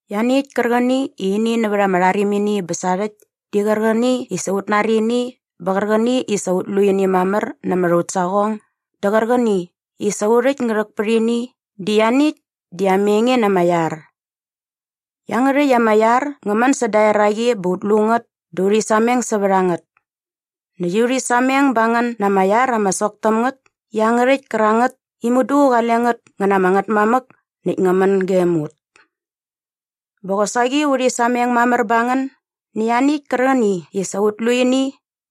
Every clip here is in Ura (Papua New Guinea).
Ianiäkt kärqäni i ini nävät ama rharimini bä sarhäkt di qärqäni i sa ut nari ini bä qärqäni i sa ut lu ini mamär nämät aut saqong dä qärqäni i sa u rhäkt ngä rhäk pät ini di ianiäkt di ama enge na ama iar. Iangärhäkt ama iar ngä män säda eraqi bä ut lu ngät dä urhi sameng sävät a ngät. Näkt urhi sameng ba ngän na ama iar ama sok täm ngät iangärhäkt kärangät i mudu qale ngät ngä na ama Ngätmamäk näkt ngä män gem ut. Bä qosaqi urhi sameng mamär ba ngän nä ianiäkt kärqäni i sa ut lu ini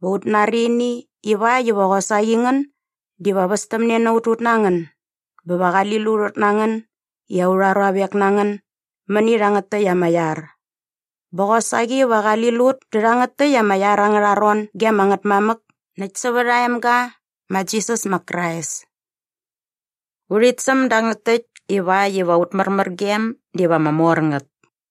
bä ut nari ini ivakt iva qosaqi ngän diva västämne na ut ut na ngän bä va qali lut ut na ngän i aurha ruavek na ngän mäni rhangät täkt ama iar. Bä qosaqi va qali lut dä rhangät täkt ama iar angärha ron ge ama Ngätmamäk näkt sävät aa emga ma Jisas ma Krais. Urhit säm dangät täkt ivakt iva aut märmärgem diva ama mor ngät.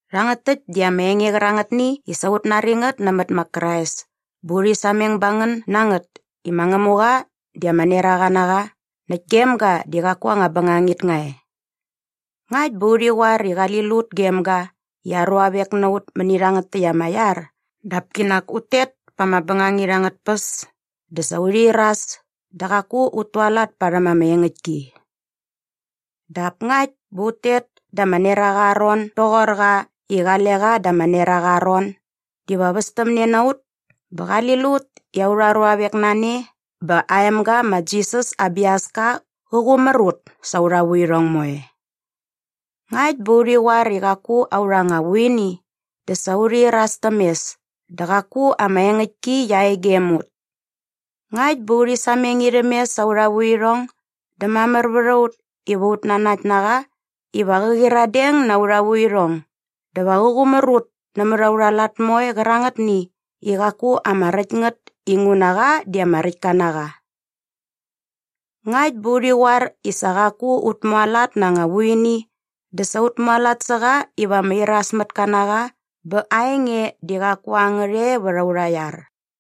Rhangät täkt di ama enge qärangätni i sa ut nari ngät nämät ma Krais bä urhi sameng ba ngän na ngät i ma Ngämuqa di ama neraqa na qa näkt gem ga di qaku anga bängangit nga e. Ngakt bä urhi qoar i qali lut gem ga i aa ruavek na ut mäni rhangät täkt ama iar dap kinak ut tet pa ama bängangit angät tpäs dä sa urhi iras dä qaku ut tualat parhäm ama engäktki. Dap ngakt bä ut tet da ama neraqa aa ron doqor qa i qale qa da ama neraqa aa ron diva västämne na ut bä qali lut i aurha ruavek na ne bä aa emga ma Jisas aa biaska qä qumär ut sa aurha vuirhong moe. Ngakt bä urhi qoar i qaku aurha anga vuini dä sa urhi iras täm mes dä qaku ama engäktki qia e gem ut. Ngakt bä urhi sameng irhäm mes sa aurha vuirhong dä mamär vät a ut iva ut nanakt na qa iva qä qyiradeng na aurha vuirhong dä va qä qumär ut nämät aurha lat moe qärangätni i qaku ama räkt ngät inguna qa di ama räkt ka na qa. Ngakt bä urhi qoar i sa qaku ut mualat na anga vuini dä sa ut mualat sä qa iva ama irasmätka na qa bä aa enge di qaku a ngät e vät aurha iar.